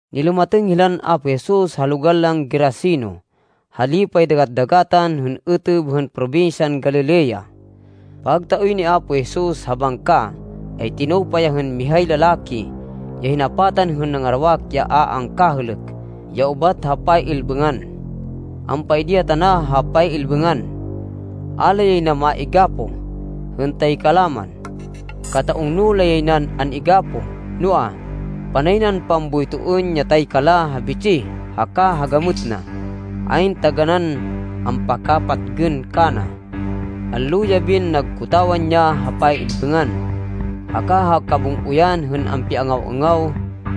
Nilumatêng hilan Apo Jesus ha logal lan Geraseno ha lipay dagat-dagatan ha êtêb hên probinsyan Galilea. Pagtaoy ni Apo Jesus ha bangka, ay tinupa ya hên mihay lalaki ya hinapatan hên nangarawak ya a angkahêlêk ya ubat ha pay-ilbêngan. Ampaidi ya tana ha pay-ilbêngan. A la yay na maigapoh, hên taykala man. Kata-ungno lay nan an-igapoh, noa, panay nan pamboytoên ya taykala ha bitsih haka ha gamêt na. Ayn taganán ampakapatgên kana. Allo-yabin nagkotawan ya ha pay-ilbêngan haka ha kabung-oyan hên ampiangaw-angaw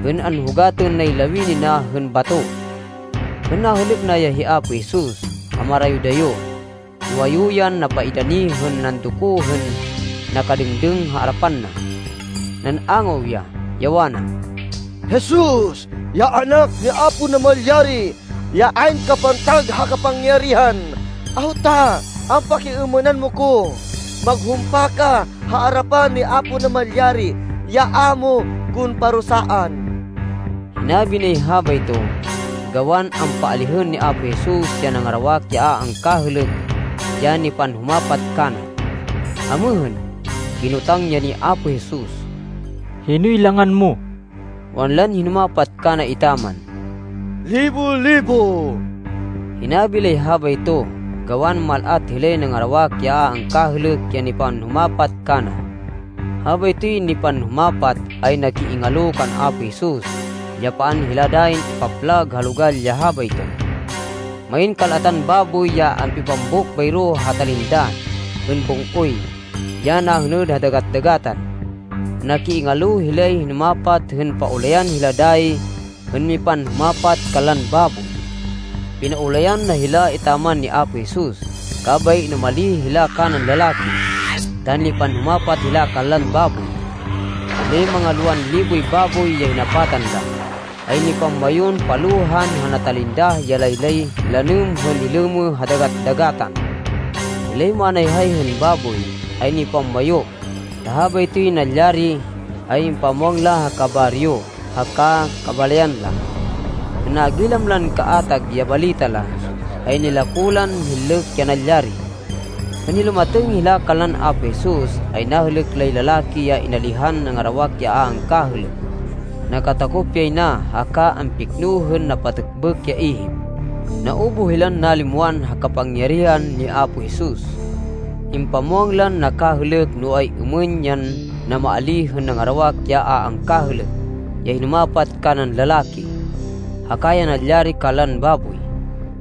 hên anhugatên nay lawini na hên bato. Hên nahêlêk na ya hi Apo Jesus ha marayo-dayo, nuwayu yan napaidani hên nandoko hên nakadêngdêng ha arapan na. Nan-angaw ya, ya wana, “Jesus, ya Anak ni Apo Namalyari ya ayn kapantag ha kapangyarihan, awta ampakiêmênan mo ko? Maghumpa ka ha arapan ni Apo Namalyari, ya a mo kon parusaan!” Hinabi nay habayto gawan ampaalihên ni Apo Jesus ya nangarawak ya a angkahêlêk ya nipanhumapat kana. Amêhên, kinotang ya ni Apo Jesus, “Hinoy langan mo?” Wanlan hinumapat kana etaman, “Libo-Libo.” Hinabi lay habayto gawan mal-at hilay nangarawak ya a angkahêlêk ya nipanhumapat kana. Habaytoy nipanhumapat ay nakiingalo kan Apo Jesus, ya paan hila dayin ipaplag ha logal ya habayto. Main kal-atan baboy ya ampipambuk bayro ha talindah hên bung-oy ya nahêned ha dagat-dagatan. Nakiingalo hilay hinumapat hên paulayan hila dayi hên mipanhumapat kanlan baboy. Pinaulayan na hila etaman ni Apo Jesus. Kabay inumalih hila kanan lalaki ta nipanhumapat hila kanlan baboy. Hilay manga lowan liboy baboy ya hinapatan la, ay nipamwayun palohan ha natalindah ya laylay lanêm hên nilêmêh ha dagat-dagatan. Hilay manayhay hên baboy, ay nipamwayu, ta habaytoy nalyari, ay impamwang la ha kabaryo haka kabalayan la. Hên nagilam lan kaatag ya balita la, ay nilako lan hinlêk ya nalyari. Hên nilumatêng hila kanlan Apo Jesus ay nahêlêk lay lalaki ya inalihan nangarawak ya a angkahêlêk. Nakatakop yay na haka ampikno hên napatêkbêk ya ihip. Naubuh hilan nalimwan ha kapangyarihan ni Apo Jesus. Impamwang lan nakahêlêk no ay-êmên yan namaalíh hên nangarawak ya a angkahêlêk ya hinumapat kanan lalaki, haka ya nalyari kanlan baboy.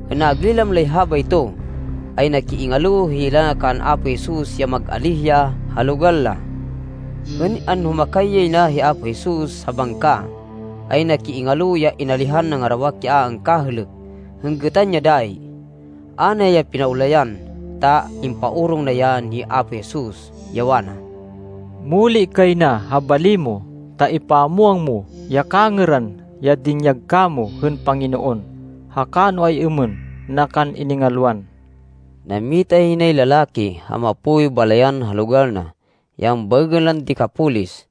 Hên nagilam lay habayto, ay nakiingalo hila kan Apo Jesus ya mag-alíh ya ha logal la. Hên anhumakay yay na hi Apo Jesus ha bangka, ay nakiingalo ya inalihan nangarawak ya a angkahêlêk hên gêtan ya dayi. A na ya pinaulayan, ta impaorong na ya ni Apo Jesus, ya wana, “Muli kay na ha bali mo ta ipamwang mo ya kangêran ya dinyag kamo hên Panginoon, haka no ay-êmên na kan iningalwan.” Nammita yay nay lalaki, ha mapoy balayan ha logal na, ya ambaêgên lan Decapolis,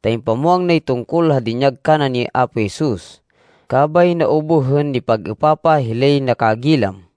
ta impamwang nay tungkol ha dinyag kana ni Apo Jesus, kabay naubuh hên nipag-êpapah hilay nakagilam.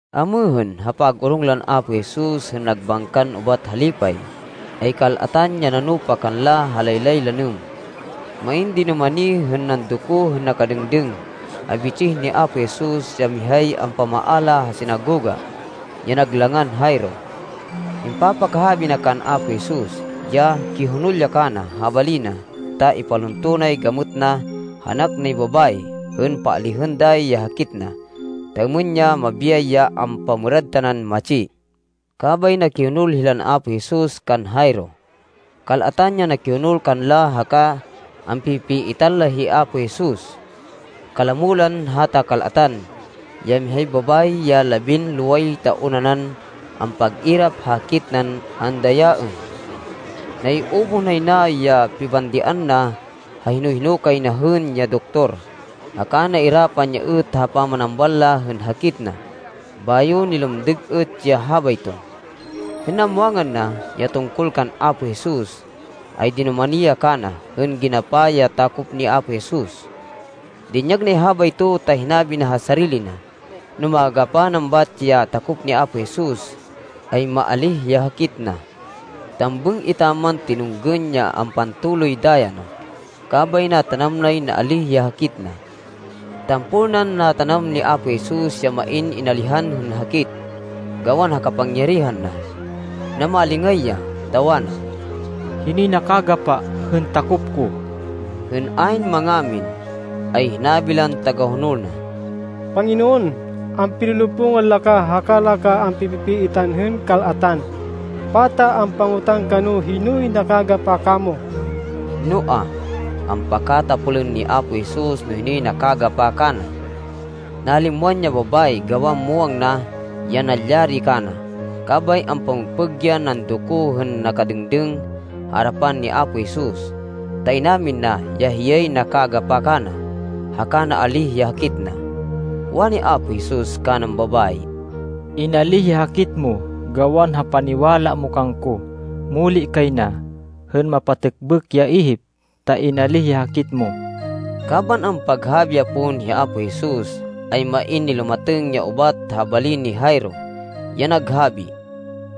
Amêhên, ha pag-orong lan Apo Jesus hên nagbangkan ubat ha lipay, ay kal-atan ya nanupa kanla ha laylay lanêm. Main dinumani hên nandoko hên nakadêngdêng ha bitsih ni Apo Jesus ya mihay ampamaala ha sinagoga, ya nag langan Jairo. Impapakahabi na kan Apo Jesus, ya kihonol ya kana ha bali na, ta ipalunto nay gamêt na ha anak nay babayi, hên paalihên dayi ya hakit na, ta êmên ya mabiyay ya ampamêrad tanan matsi. Kabay nakihonol hilan Apo Jesus kan Jairo. Kal-atan ya nakihonol kanla haka ampi-pipiitan la hi Apo Jesus. Kalamo lan hata kal-atan, ya mihay babayi ya labinloway taon nanan ampag-irap ha hakit nan andayaên. Naiubuh nay na ya pibandian na ha hino-hino kay na hên ya doktor, haka nairapan ya êt ha pamanambal la hên hakit na, bayo nilumdêg êt ya habayto. Hên namwangan na, ya tungkol kan Apo Jesus, ay dinumani ya kana hên ginapa ya takop ni Apo Jesus. Dinyag nay habayto ta hinabi na ha sarili na, no magapa nan bat ya takop ni Apo Jesus, ay maalíh ya hakit na. Tambêng etaman tinunggên ya ampantoloy daya na, kabay natanam nay naalíh ya hakit na. Tampol nan natanam ni Apo Jesus ya main inalihan hên hakit, gawan ha kapangyarihan na. Namalingay ya, ta wana, “Hinoy nakagapa hên takop ko?” Hên ayn mangamin, ay hinabi lan tagahonol na, “Panginoon, ampilolopungan la ka, haka la kan ampi-pipiitan hên kal-atan! Pata ampangotang ka no hinoy nakagapa kamo!” Noa, ampakatapolên ni Apo Jesus no hinoy nakagapa kana. Nalimwan ya babayi gawan muwang na ya nalyari kana. Kabay ampamêgpêg yan nandoko hên nakadêngdêng ha arapan ni Apo Jesus, ta inamin na ya hiyay nakagapa kana haka naalíh ya hakit na. Wani Apo Jesus kanan babayi, “Inalíh ya hakit mo gawan ha paniwala mo kangko. Muli kay na, hên mapatêkbêk ya ihip ta inalíh ya hakit mo.” Kaban ampaghabi ya pon hi Apo Jesus, ay main nilumatêng ya ubat ha bali ni Jairo, ya naghabi,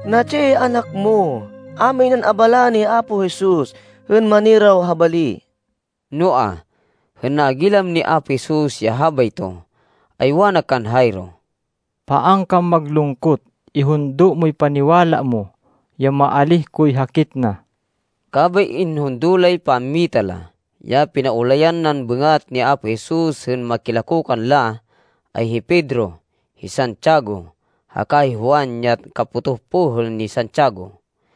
“Natsi ya anak mo. A minan abalaên hi Apo Jesus hên maniraw ha bali.” Noa, hên nagilam ni Apo Jesus ya habayto, ay wana kan Jairo, “Paan kan maglungkot. Ihundo moy paniwala mo ya maalíh koy hakit na.” Kabay inhundo lay pammita la. Ya pinaulayan nan bêngat ni Apo Jesus hên makilako kanla, ay hi Pedro, hi Santiago haka hi Juan ya kapotoh pohêl ni Santiago.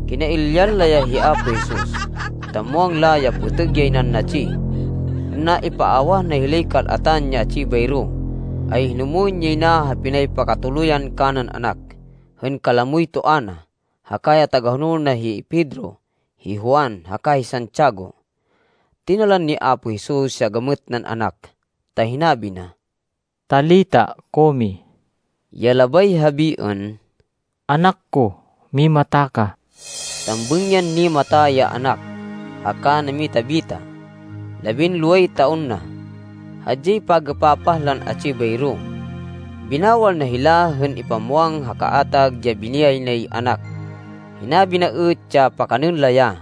Kinailyan la ya hi Apo Jesus, ta muwang la ya pêtêg yay nan natsi. Hên naipaawah na hilay kal-atan ya atsi bayro, ay hinumwên yay na ha pinaypakatuluyan kanan anak, hên kalamoy toa na, haka ya tagahonol na hi Pedro, hi Juan, haka hi Santiago. Tinalan ni Apo Jesus ya gamêt nan anak, ta hinabi na, “Talita kumi,” ya labay habiên, “Anak ko, mimata ka.” Tambêng yan nimata ya anak, haka namita-bita. (Labinloway taon na.) Hadyay pag-êpapah lan atsi bayro. Binawal na hila hên ipamwang ha kaatag ya biniyay nay anak. Hinabi na êt ya pakanên la ya.